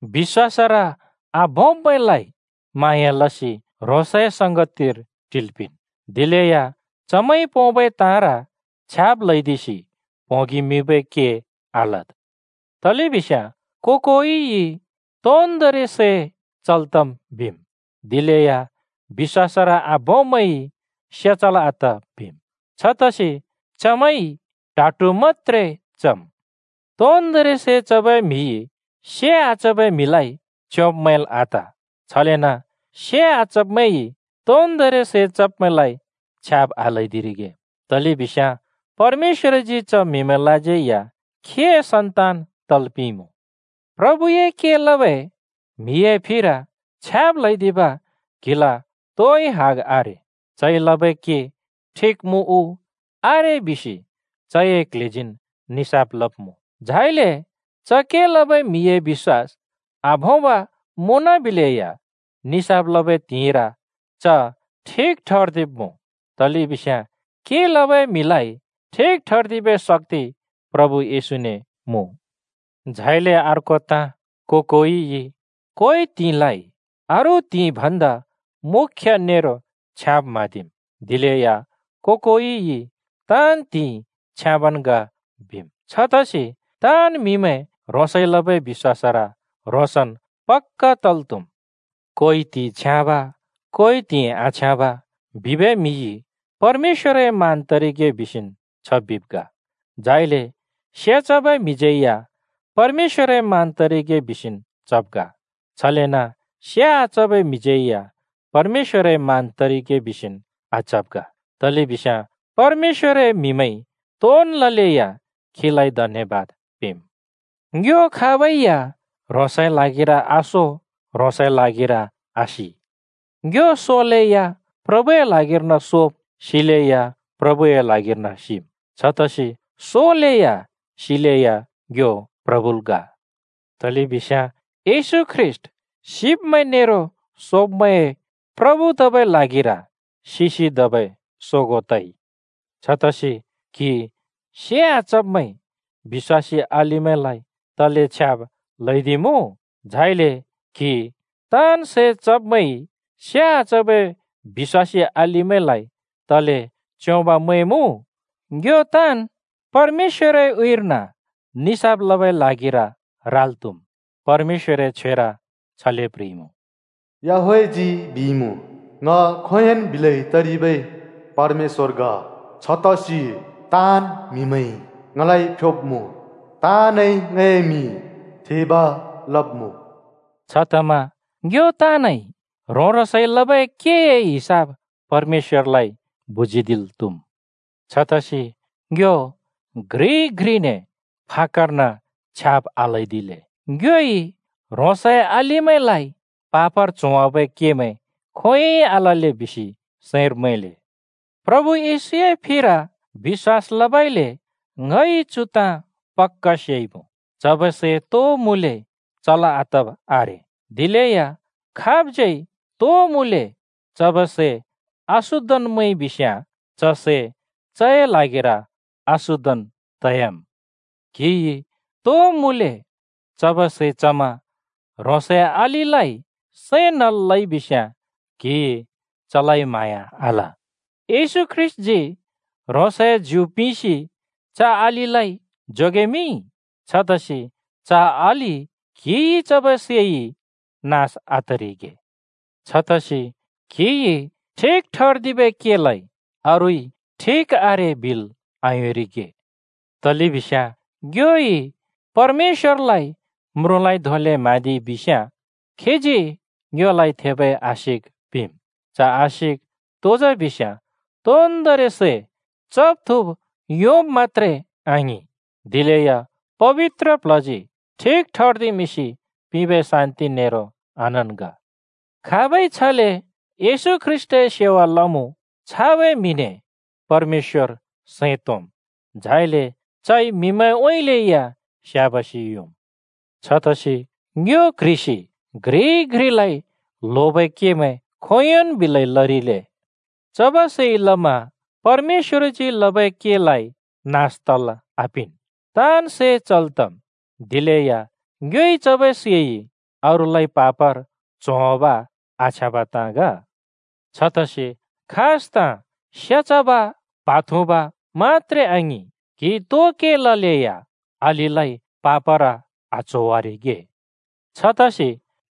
बिश्‍वासर आभोंब्मैंलाइ म्हाँया लसि ह्रोंसए संगतिर टिल् पिंन्। दिलेया चमैंइ पोंबै ताँर छ्याब् ल्हैदिसि प्होंगि मिबै के आलद्। तलेबिस्याँ को-कोइइ तोन्दोंरि सै चल् तम् बिम्, दिलेया बिश्‍वासर आभोंब्‍मैंइ से चल् आत बिम्, छतसि चमैंइ ट्हा ट्हु मत्‍त्रे चम्। तोन्दोंरि सै चबै म्‍हिइ से आचबै म्हिलाइ च्‍योंब् मैंल् आत। छलेन से आचब्‍मैंइ तोन्दोंरि सै चब्‍मैंलाइ छ्याब् आल्‍हैदिरिगे, तलेबिस्याँ परमेश्‍वरजी च म्हिमैंलाज्यै या खीए सन्तान तल् पिंइमुँ। प्रभुए के लबै म्हिए फिर छ्याब् ल्‍हैदिब क्‍हिल तोइ हग आरे। चइ लबै के ठिक मुँ उ आरे बिसि चए क्ल्हेजीन् निसाफ लब्‍मुँ। झाइले च के लबै म्हिए बिश्‍वास आभोंब मुँनबिलेया निसाफ लबै त्हिंइर च ठिक ठर्दिब्‍मुँ, तलेबिस्याँ के लबै म्हिलाइ ठिक ठर्दिबै शक्‍ति प्रभु येशूने मुँ। झाइले अर्को ताँ, को-कोइइ कोइ त्हिंइलाइ अरू त्हिंइ भन्दा मुख्‍य नेरो छ्याँब म्हाँदिम्, दिलेया को-कोइइ ताँन् त्हिंइ छ्याँबन् ग बिम्। छतसि ताँन् म्‍हिमैं ह्रोंसइ लबै बिश्‍वासर ह्रोंसन् पक्‍का तल् त्हुम्। कोइ त्हिंइ छ्याँब कोइ त्हिंइ आछ्याँब बिबै म्हिइ परमेश्‍वरए मान तरिगे बिसिन् छ बिब् ग। झाइले से चबै म्हिज्यै या परमेश्‍वरए मान तरिगे बिसिन् चब् ग, छलेन से आचबै म्हिज्‍यै या परमेश्‍वरए मान तरिगे बिसिन् आचब् ग, तलेबिस्याँ परमेश्‍वरए म्हिमैंइ तोन् ललेया खीलाइ धन्‍यबाद पिंम्। ङ्यो खाबै या ह्रोंसए ल्हागिर आसो, ह्रोंसए ल्हागिर आसि। ङ्यो सोलेया प्रभुए ल्हागिर्न सोम्, सिलैया प्रभुए ल्हागिर्न सिम्। छतसि सोलेया सिलेया ङ्यो प्रभुल ग। तलेबिस्याँ येशू ख्रीष्‍ट सिब्‍मैं नेरो सोब्‍मैंए प्रभु तबै ल्हागिर सिसि धबै सोगों तइ। छतसि क्‍हि से आचब्‍मैंइ बिश्‍वासी अलिमैंलाइ तले छ्याब् ल्‍हैदिमुँ? झाइले क्‍हि ताँन् सै चब्‍मैंइ से आचबै बिश्‍वासी अलिलाइ तले च्‍योंब मैंमुँ? ङ्यो ताँन् परमेश्‍वरए उँइँर्न निसाफ लबै ल्हागिर राल् त्‍हुम्। परमेश्‍वरए छ्वेर छले प्ह्रिइमुँ, “याहवेहजी बिइमुँ, ङ खोंयोंन् बिलै तरिबै परमेश्‍व ग। छतसि ताँन् म्‍हिमैंइ ङलाइ फ्‍योब्‍मुँ, ताँनइ ङए मिं थेब् लब्‍मुँ।” छतमा ङ्यो ताँनइ ह्रों-ह्रोंसइ लबै केए हिसाब परमेश्‍वरलाइ बुजीदिल् त्‍हुम्। छतसि ङ्यो घ्रिइ घ्रिने फाक्‍कर्न छ्याब् आल्‍हैदिले, ङ्योइ ह्रोंसए अलिमैंलाइ पापर च्होवाबै केमैं खोंयोंइ आलले बिसि सैंर मैंले। प्रभु येशूए फिर बिश्‍वास लबइले ङइ चु ताँ पक्‍का सेइमुँ, चबै सै तो मुँले चल् आतब आरे। दिलेया खाबज्‍यै तो मुँले चबै सै अशुद्धन् मैंइ बिस्याँ च सै चए ल्हागिर अशुद्धन् तयाम्। क्‍हिइ तो मुँले चबै सै चमा ह्रोंसए अलिलाइ सैं नल् लइबिस्‍याँ क्‍हिइ चलाइ म्हाँया आल। येशू ख्रीष्‍टजी ह्रोंसए ज्यु पिंसि च अलिलाइ जोगेमिंइ। छतसि च अलि क्‍हिइ चबै सैइ नास आतरिगे। छतसि क्‍हिइ ठिक ठर्दिबै केलाइ अरूइ ठिक आरे बिल् आयोंरिगे। तलेबिस्याँ ङ्योइ परमेश्‍वरलाइ म्रुँलाइ धोंले म्हाँदिइ बिस्‍याँ खीजी ङ्योलाइ थेबै आशिक पिंम्। च आशिक तो जा बिस्‍याँ तोन्‍दोंरि सै चब् थुँब् योंब मत्‍त्रे आङिं, दिलेया पबित्र प्ल्हजी ठिक ठर्दिमिंसि पिंबै शान्‍ति नेरो आनन्‍द ग। खाबइ छले येशू ख्रीष्‍टए सेवा लमुँ, छाबै म्हिने परमेश्‍वर सैं तोंम्, झाइले चइ म्हिमैंउँइँले या स्‍याबासि योंम्। छतसि ङ्यो क्ह्रिसि घ्रिइ घ्रिलाइ ल्होबै केमैं खोंयोंन् बिलै लरिले। चबै सैइ लमा परमेश्‍वरजी लबै केलाइ नास तल् आपिंन्। ताँन् सै चल् तम्, दिलेया ङ्योइ चबै सैइ अरूलाइ पापर च्होवाब आछ्याँबै ताँ ग। छतसि खास ताँ, से चब, प्हा थुँब मत्‍त्रे आङिं, क्हिइ तो के ललेया अलिलाइ पापर आच्होवारिगे। छतसि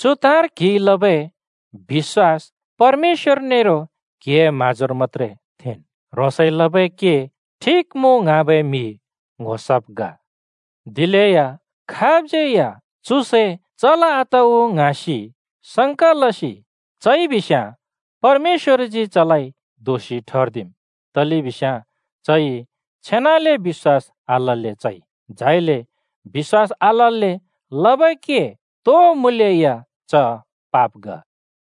चु ताँर क्हिइ लबै बिश्‍वास परमेश्‍वर नेरो क्हिए म्हाँजोर मत्‍त्रे थेंन्। ह्रोंसइ लबै के ठिक मुँ ङ्हाँबै म्हि ङ्‍हो सब् ग। दिलेया खाबज्‍यै या “चु सै चल् आत उ?” ङ्हाँलै या चइ बिस्‍याँ परमेश्‍वरजी चलाइ दोषि ठर्दिम्, तलेबिस्याँ चइ छेनाले बिश्‍वास आलल्‍ले चइ। झाइले बिश्‍वास आलल्‍ले लबै के तो मुँले या च पाप ग।